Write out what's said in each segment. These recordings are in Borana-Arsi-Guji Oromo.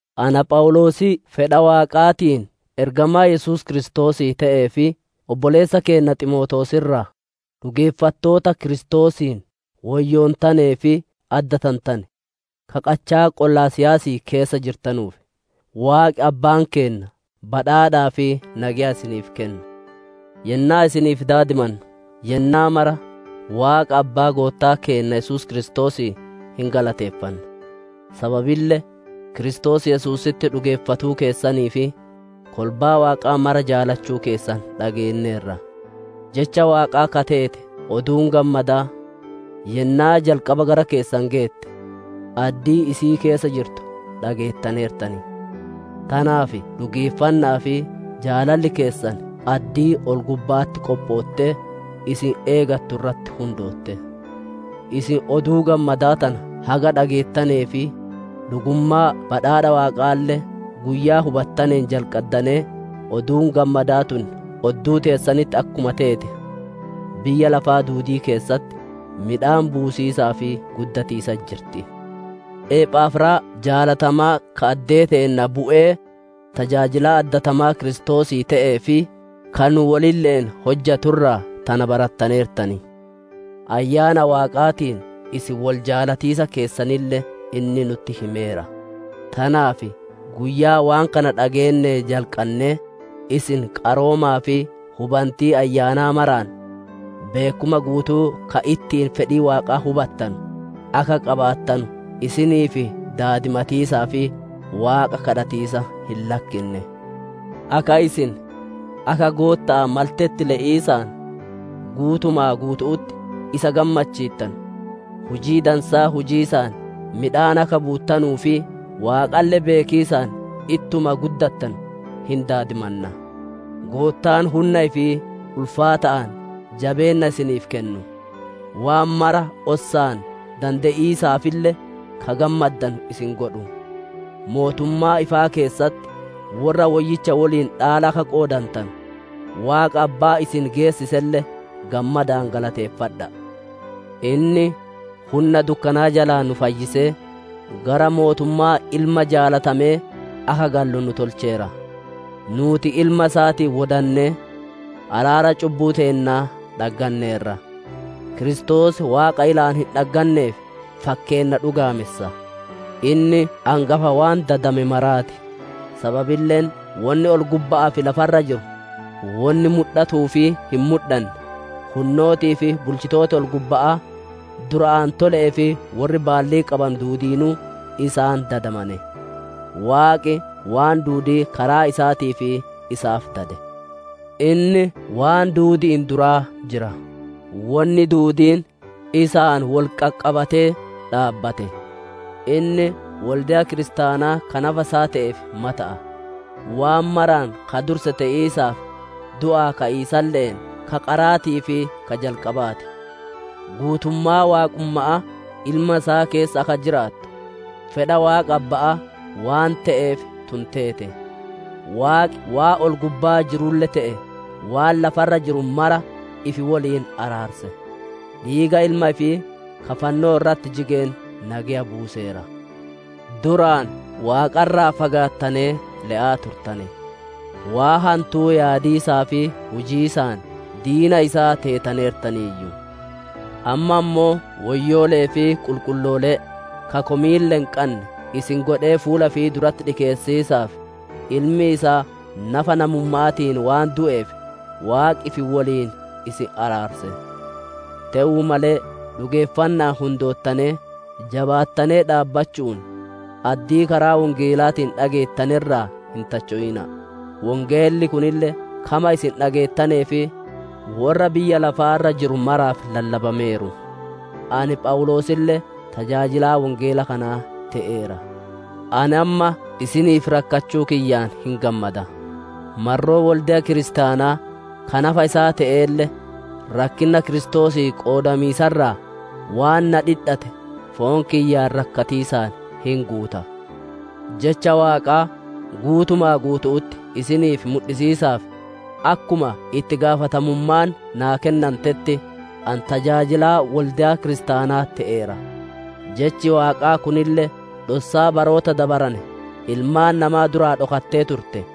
Ana Phawuloosii fedha Waaqaatiin ergamaa Yesuus Kiristoosii te'ee fi obboleessa keenna Ximootewoos irraa, dhugeeffattoota Kiristoosiin woyyoontanee fi addatantane, ka qachaa Qolosaayisii keessa jirtanuuf: Waaqi Abbaan keenna badhaadhaa fi nageya isiniif kennu. Yennaa isiniif daadimannu, yennaa mara Waaqa Abbaa Goottaa keenna Yesuus Kiristoosii hin galateeffanna. Sababille Kiristoos Yesuusitti dhugeeffatuu keessanii fi kolbaa Waaqaa mara jaalachuu keessan dhageenneerra. Jecha Waaqaa ka teete Oduun Gammadaa, yennaa jalqaba gara keessan geette, addii isii keessa jirtu dhageettaneertan; tanaaf dhugeeffanna'aa fi jaalalli keessan addii ol-gubba'atti qophoottee, isin eegattu irratti hundootte. Isin Oduu Gammadaa tana haga dhageettanee fi dhugummaa badhaadha Waaqaalle guyyaa hubattaneen jalqaddanee, Oduun Gammadaa tun odduu teessanitti akkuma teete, biyya lafaa duudii keessatti midhaan buusiisaa fi guddatiisatti jirti. Ephafraas jaalatamaa ka addee teenna bu'ee tajaajilaa addatamaa Kiristoosii te'ee fi ka nu wolille'een hojjatu irraa tana barattaneertan. Ayyaana Waaqaatiin isin wol jaalatiisa keessanille inni nutti himeera. Tanaaf guyyaa waan kana dhageennee jalqannee, isin qaroomaa fi hubantii Ayyaanaa maraan, beekkuma guutuu ka ittiin fedhii Waaqaa hubatanu akka qabaattanu isiniif daadimatiisaa fi Waaqa gaafatiisa hin lakkinne. Akka isin akka Gootta'aa maltetti le'iisaan guutuma guutu'utti isa gammachiittanu, hujii dansaa hujiisaan midhaan akka buuttanuu fi Waaqalle beekiisaan ittuma guddattanu hin daadimanna. Goottaan hunna ifii ulfaata'aan, jabeenna isiniif kennu; waan mara ossaan dande'iisaafille ka gammaddanu isin godhu. Mootummaa ifaa keessatti worra woyyicha woliin dhaala akka qoodattanu, Waaqa Abbaa isin geessiselle gammadaan galateeffadha'a. Inni hunna dukkanaa jalaa nu fayyisee gara mootummaa Ilma jaalatamee akka gallu nu tolcheera. Nuuti Ilma isaatiin wodannee, araara cubbuu teennaa dhagganneerra. Kiristoos Waaqa ilaan hin dhagganneef fakkeenna dhugaamessa. Inni angafa waan dadame maraa ti. Sababilleen wonni ol-gubba'aa fi lafa irra jiru, wonni mudhatuu fi hin mudhanne, hunnootii fi bulchitooti ol-gubba'aa, dura aantole'ee fi worri baallii qabanu duudiinuu isaan dadamane. Waaqi waan duudii karaa isaatii fi isaaf dade. Inni waan duudi'iin duraa jira; wonni duudiin isaan wol qaqqabatee dhaabbate. Inni wolde'a kiristaanaa ka nafa isaa te'eef mata'a; waan maraan ka durse te'iisaaf, du'aa ka'iisalle'een ka qaraatii fi ka jalqabaa ti. Guutummaa waaqumma'aa Ilma isaa keessa akka jiraattu, fedha Waaqa Abba'aa waan te'eef tun teete. Waaqi waan ol-gubbaa jirulle te'ee, waan lafa irra jiru mara ifi woliin araarse; dhiiga Ilma ifii ka fannoo irratti jigeen nageya buuseera. Duraan Waaqa irraa fagaattanee le'aa turtane; waan hantuu yaadiisaa fi hujiisaan diina isaa teetaneertaniiyyu. Amma ammoo woyyoole'ee fi qulqulloolee, ka komiille hin qanne isin godhee fuula ifii duratti dhikeessiisaaf, Ilmi isaa nafa namumma'aatiin waan du'eef Waaqi ifi woliin isin araarse. Te'uu malee dhugeeffanna'aan hundoottanee, jabaattanee dhaabbachu'uun, addii karaa wongeelaatiin dhageettane irraa hin tacho'ina'a. Wongeelli kunille kama isin dhageettanee fi worra biyya lafaa irra jiru maraaf lallabameeru; ani Phawuloosille tajaajilaa wongeela kanaa te'eera. Ani amma isiniif rakkachuu kiyyaan hin gammada; marroo wolde'a kiristaanaa ka nafa isaa te'eelle, rakkinna Kiristoosii qoodamiisa irraa waan naa dhidhate foon kiyyaan rakkatiisaan hin guuta. Jecha Waaqaa guutuma guutu'utti isiniif mudhisiisaaf, akkuma itti gaafatamummaan naa kennantetti ani tajaajilaa wolde'a kiristaanaa te'eera. Jechi Waaqaa kunille, dhossaa baroota dabarane ilmaan namaa duraa dhokattee turtee,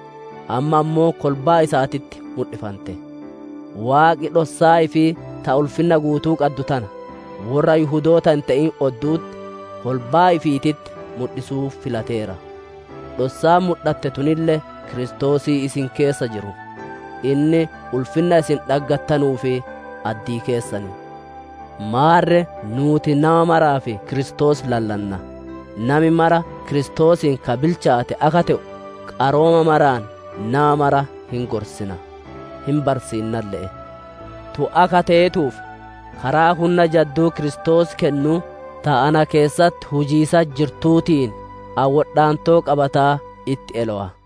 amma ammoo kolbaa isaatitti mudhifante. Waaqi dhossaa ifii ta ulfinna guutuu qaddu tana worra Yihudoota hin te'in oddu'utti, kolbaa ifiititti mudhisuu filateera. Dhossaan mudhatte tunille Kiristoosii isin keessa jiru; inni ulfinna isin dhaggattanuuf addii keessan. Maarre nuuti nama maraaf Kiristoos lallanna. Nami mara Kiristoosiin ka bilchaate akka te'u, qarooma maraan nama mara hin gorsina, hin barsiinnalle'e. Tun akka teetuuf, karaa hunna jadduu Kiristoos kennuu, ta ana keessatti hujiisatti jirtuutiin, ani wodhaantoo qabataa itti elowa.